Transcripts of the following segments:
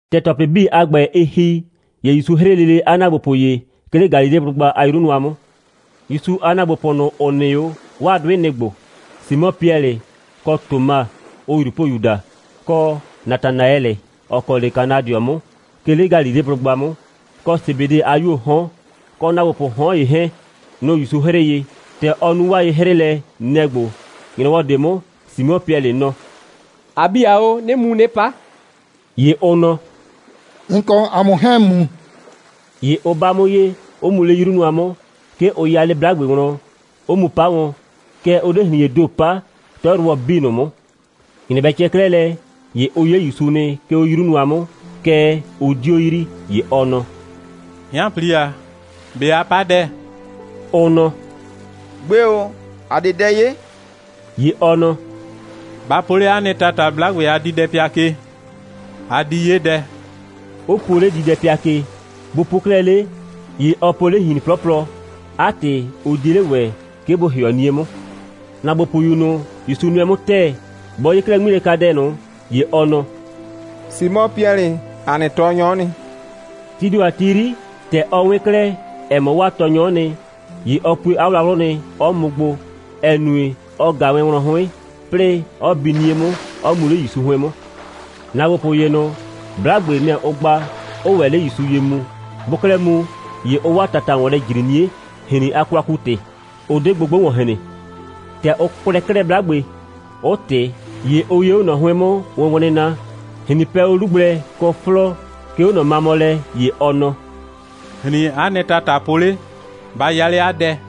‑Tɛ ‑tɔplɩ 'bii a ‑gbɛ, ɩ ‑hi, ‑ye ‑Yusu 'hrɩɩ lele 'a ‑naagbopʋ ye, 'ke 'le Galileblʋgba a 'yru nʋa 'mʋ. ‑Yusu a ‑naagbopʋ ꞊nʋ, ‑ʋ nɩ 'o, 'waa 'dʋɩ, nɩ‑ ‑gbo: Simɔ Piɛlɩ, kɔ Toma, ʋʋ ꞊Yrupoyu daa, kɔ Natanaɛlɩ, ‑ɔ kɔ 'le Kanadɩɔ 'mʋ, 'ke 'le Galileblʋgba 'mʋ, kɔ Sebede a 'yuoo 'hɔn, kɔ ‑naagbopʋʋ 'hɔn ‑ye 'hɛɛn. Nʋ‑ ‑Yusu 'hrɩɩ ye. ‑Tɛ ɔ nu 'waa ye'hrɩɩlɛ, nɛ‑ ‑gbo: ‑Nyrɔwɔ ꞊de 'mʋ, Simɔ Piɛlɩ nɔ: «‑A 'bi ‑a o, 'nɩɩ mu 'nɩ 'pa.» ‑Ye ʋ nɔ: «‑N kɔ ‑a mʋ 'hɛɛn‑ mu.» ‑Ye ʋ 'ba 'mʋ ye, 'ʋ mu 'le 'yru nʋa 'mʋ. 'Ke ʋ 'ya 'le 'blagbe wlɔn, 'ʋ mu 'pa wɔn. Kɛɛ, ʋ 'de ‑hrin.ee ‑do 'pa, 'tɔyrʋwɔ 'bii ꞊nʋ 'mʋ. ‑Nyrɛ bɛ cɛ 'klɛɛ lɛ, ‑ye ʋ 'ye ‑Yusu nɩ, 'ke 'o 'yru nʋa 'mʋ, kɛɛ, ʋ 'dio yrii. ‑Ye ɔ nɔ: «'Hɩanpli ‑a, ꞊be a 'pa dɛ?» Ʋ nɔ: «Gbe ‑o, ‑a 'de dɛ 'ye.» ‑Ye ɔ nɔ: «Ba po 'le 'a nɩ ‑tata 'blagbe a diidɛpɩa ke. A di 'ye dɛ,» 'ʋ puo 'le diidɛpɩa ke. Bʋ puo 'klɛɛ 'le, ‑ye ɔ po 'le ‑hrin 'plɔplɔ. 'A ‑tɩ, ʋ 'die 'le ‑wɛ, 'ke bʋ ‑hɩɔ 'nie 'mʋ. ‑Naagbopʋyu ꞊nʋ, ‑Yusu nʋɛ 'mʋ ‑tɛɛ, bɔ 'ye 'klɛɛ 'ŋmilɛkadɛ ꞊nʋ, ‑ye ɔ nɔ: «Simɔ Piɛlɩ, ‑a nɩ Tɔɔnyɔ'ɔ nɩ.» Tii ‑do a ti 'yri, ‑tɛ ɔ 'wɩn 'klɛɛ, ‑ɛ mɔ, 'waa Tɔɔnyɔ'ɔ nɩ, ‑ye ɔ pue 'a wlawlʋ nɩ, 'ɔ mʋ gbo, ‑ɛ nue, ɔ ꞊ga wɛn wlɔn 'hʋɩn, 'plɩɩ 'ɔ bi 'nie 'mʋ, 'ɔ mu 'le ‑Yusu 'hʋɩn 'mʋ. ‑Naagbopʋ ‑ye ꞊nʋ, 'blagbe, nɛ‑ ʋ gba, 'ʋʋ ‑wɛ 'le ‑Yusu ye mu. Bʋʋ 'klɛɛ mu, ‑ye ʋʋ 'waa ‑tata ‑wɔn lɛ ‑jri 'nie, ‑hrin a kwaku‑tɩ. Ʋ 'de gbogbo ‑wɔn hren. ‑Tɛ ʋ kwlɛɛ 'klɛɛ 'blagbe, 'ʋ ꞊tɩ. ‑Ye ʋ 'ye 'o ꞊nɔ 'hʋɩn 'mʋ wʋnwlɩnna, ‑hrin pɛ 'o 'lu gblɛ kɔ 'flɔɔ, 'ke 'o ꞊nɔ mamɔ lɛ. ‑Ye ɔ nɔ: «‑Hrin, 'a nɩ ‑tata po 'le, ba ya 'le 'a dɛ!»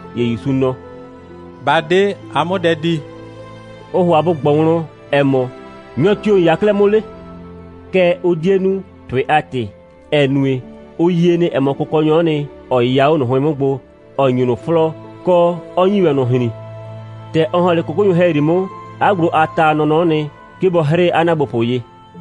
‑Ye ‑Yusu nɔ: «Ba 'de, a 'mʋ dɛ di!» Ʋ ‑hʋa bʋ ꞊gbɔ wlɔn, ‑ɛ mɔ: «Nyɔ tio‑ ‑n 'ya 'klɛɛ 'le?» kɛɛ, ʋ 'die nu, ‑tʋɩ a ‑tɩ, ‑ɛ nue, ʋ yie nɩ, ‑ɛ mɔ, Kʋkɔnyɔ'ɔ nɩ, 'ɔ 'yɩya 'o ꞊nʋ 'hʋɩn 'mʋ gbo, 'ɔ ‑nyi ꞊nʋ 'flɔɔ, kɔ, 'ɔ ‑nyi ‑wɛ ꞊nʋ ‑hrin. ‑Tɛ ɔ ‑hɔn 'le 'kʋkʋnyʋ ‑hɛyri 'mʋ, 'a gblo a ta a nɔnɔ'ɔ nɩ, 'ke bɔ 'hrɩɩ 'a ‑naagbopʋ ye.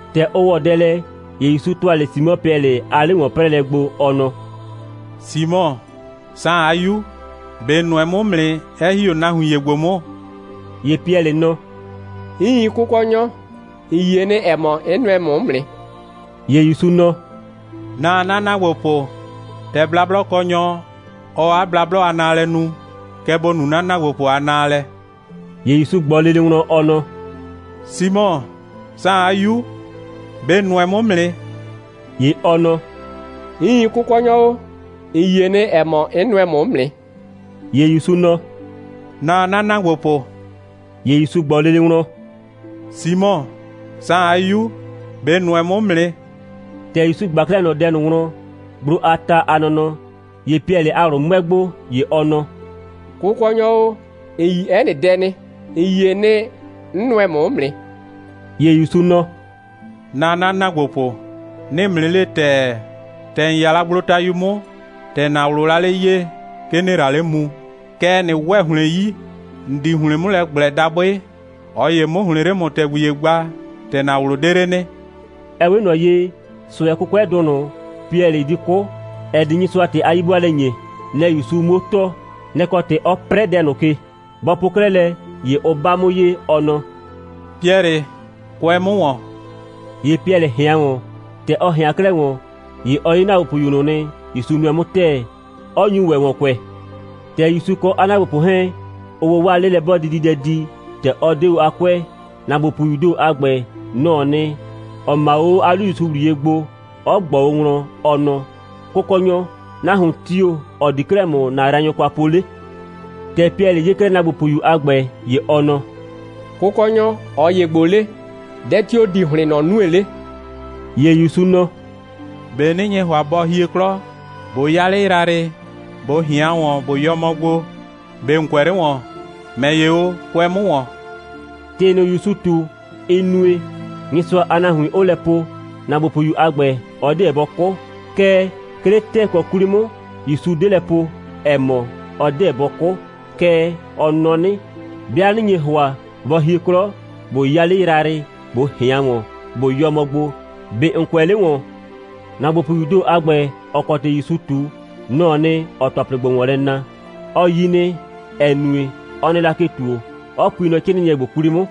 ‑Tɛ ʋ ‑wɔ dɛ lɛ, ‑ye ‑Yusu ‑tʋa 'le Simɔ Piɛlɩ a 'le‑wɔn'prɛɛlɛ gbo, ɔ nɔ: «Simɔ, Saan a 'yu, ꞊be ‑n nʋɛ 'mʋ 'mʋ nɩ, 'ɛ ‑hi 'o nahuin ‑ye ‑gbo 'mʋ?» ‑Ye Piɛlɩ nɔ: «Iin, Kʋkɔnyɔ, ‑n yie nɩ, ‑ɛ mɔ, 'n nʋɛ ‑mʋ 'mʋ nɩ.» ‑Ye ‑Yusu nɔ: «Naa 'na ‑naagbopʋ. ‑Tɛ blablɔkɔnyɔ, ɔɔ 'a blablɔ a naalɛ nu, kɛ ‑bo nu 'na ‑naagbopʋ a naalɛ.» ‑Ye ‑Yusu ꞊gbɔ lele wlɔn, ɔ nɔ: «Simɔ, Saan a 'yu, ꞊be ‑n nʋɛ 'mʋ 'mʋ nɩ?» ‑Ye ɔ nɔ: «Iin, Kʋkɔnyɔ o, ‑n yie nɩ, ‑ɛ mɔ, 'n nʋɛ ‑mʋ 'mʋ nɩ.» ‑Ye ‑Yusu nɔ: «Naa 'na ‑naagbopʋ!» ‑Ye ‑Yusu ꞊gbɔ lele wlɔn: «Simɔ, Saan a 'yu, ꞊be ‑n nʋɛ 'mʋ 'mʋ nɩ?» ‑Tɛ ‑Yusu ꞊gba 'klɛɛ ꞊nɔ dɛ ꞊nʋ wlɔn, gblo a ta a nɔnɔ, ‑ye Piɛlɩ a ꞊wlʋ 'mʋɛ gbo, ‑ye ɔ nɔ: «Kʋkɔnyɔ o, ‑n yi 'ɛ nɩ dɛ nɩ. ‑N yie nɩ, 'n nʋɛ ‑mʋ 'mʋ nɩ.» ‑Ye ‑Yusu nɔ: «Naa 'na ‑naagbopʋ! 'Nɩɩ ‑mʋ 'nɩ le ‑tɛɛ, ‑tɛ ‑n 'ya la gblotayu 'mʋ, ‑tɛ ‑na ꞊wlʋʋ la 'le 'yee, 'ke ‑nɩɩ la 'le mu, kɛɛ, ꞊nɩ ‑wɛ ‑hlɩn 'yi, ‑n di ‑hlɩn 'mʋ lɛ ꞊gblɛ dabʋɩ, ꞊ɔ ‑ye 'mʋ ‑hlɩn 'le ‑mʋ ‑tɛgbi ‑ye gba, ‑tɛ ‑na ꞊wlʋ 'de 'le nɩ.» Ɛ 'we ꞊nɔ ye, ꞊sʋɛ'kʋkʋɛdʋ ꞊nʋ, Piɛlɩ di 'kʋ, ‑ɛ di Nyɩsʋa ‑tɩ a 'yi'bʋaalɛ ‑nye, nɛ‑ ‑Yusu 'muo tɔɔ. Nɛ‑ kɔ ‑tɩ, 'ɔ 'prɛɛ dɛ ꞊nʋ ke. Bɔ po 'klɛɛ lɛ, ‑ye ʋ 'ba 'mʋ ye, ɔ nɔ: «Piɛlɩ, kʋɛ 'mʋ ‑wɔn!» ‑Ye Piɛlɩ ꞊hɩan ‑wɔn. ‑Tɛ ɔ ꞊hɩan 'klɛɛ ‑wɔn, ‑ye ɔ 'ye ‑naagbopʋyu ꞊nʋ nɩ, ‑Yusu nʋɛ 'mʋ ‑tɛɛ, 'ɔ nyu ‑wɛ ‑wɔn kʋɛ. ‑Tɛ ‑Yusu kɔ 'a ‑naagbopʋ 'hɛɛn, ʋʋ o 'waa 'lelɛ'bɔɔdididɛ di, ‑tɛ ɔ 'de o a 'kʋɛ, ‑naagbopʋyuu ‑do a ‑gbɛ, nɔ‑ɔ nɩ, ‑ɔ 'ma o 'o 'a 'lu ‑Yusu ‑wliye gbo, 'ɔ ꞊gbɔ o wlɔn, ɔ nɔ: «Kʋkɔnyɔ, nahuon tio‑, ‑ɔ di 'klɛɛ ‑mʋ ‑na yraanyʋ kwa po 'le?» ‑Tɛ Piɛlɩ 'ye 'klɛɛ ‑naagbopʋyu a ‑gbɛ, ‑ye ɔ nɔ: «Kʋkɔnyɔ, ꞊ɔ ‑ye ‑gbo 'le? Dɛ tio‑ di ‑hlɩn ꞊nɔ nue 'le?» ‑Ye ‑Yusu nɔ: «꞊Be 'nɩ nye ‑hʋa, bɔ hie 'klɔ, ꞊bo 'ya 'le yrayrɩ, ꞊bo ꞊hɩan ‑wɔn, ꞊bo yɔ mɔ gbo, ꞊be ‑n kʋɛ 'le ‑wɔn? ‑Mɛ ‑ye o, kʋɛ 'mʋ ‑wɔn!» ‑Tɩ ꞊nʋ, ‑Yusu ꞊tu, ɩ nue, Nyɩsʋa a nahuin 'ʋʋ lɛ po, ‑naagbopʋyu a ‑gbɛ, ɔ 'deɛ bɔ 'kʋ. Kɛɛ, 'ke 'le ‑tɛɛkɔ 'kwli 'mʋ, ‑Yusu 'de lɛ po, ‑ɛ mɔ: «Ɔ 'deɛ bɔ 'kʋ,» kɛɛ, ɔ nɔ 'nɩ: «'Bɩa 'nɩ nye ‑hʋa, bɔ hie 'klɔ, ꞊bo 'ya 'le yrayrɩ, ꞊bo ꞊hɩan ‑wɔn, ꞊bo yɔ mɔ gbo, ꞊be ‑n kʋɛ 'le ‑wɔn?» ‑Naagbopʋyuu ‑do a ‑gbɛ, ‑ɔ kɔ ‑tɩ ‑Yusu ꞊tu, nɔ‑ɔ nɩ, ‑ɔɔ ‑tɔplɩ ‑gbo ‑wɔn lɛ na. Ɔ 'yi nɩ, ‑ɛ nue, ɔ nɩ la ke ‑tuo, 'ɔ pui nɔ 'crɩɩnɩɛ ‑gbo 'kwli 'mʋ.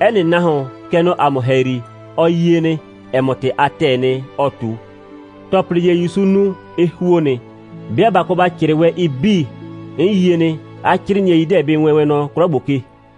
'Ɛ nɩ nahuon, kɛ nɔ ‑a mʋ ‑hɛyri, ɔ yie nɩ, ‑ɛ mɔ, ‑tɩ a ‑tɛɛ nɩ, ɔɔ ꞊tu. ‑Tɔplɩ ‑ye, ‑Yusu nu, ɩ ‑huo nɩ. 'Bɩa ꞊ba kɔ ‑ba 'crɩɩ wɛn ɩ 'bii, 'n yie nɩ, 'a 'crɩɩnɩɛi 'deɛ bɩ wɛɛn wɛn nɔ 'klɔ ‑gbo ke.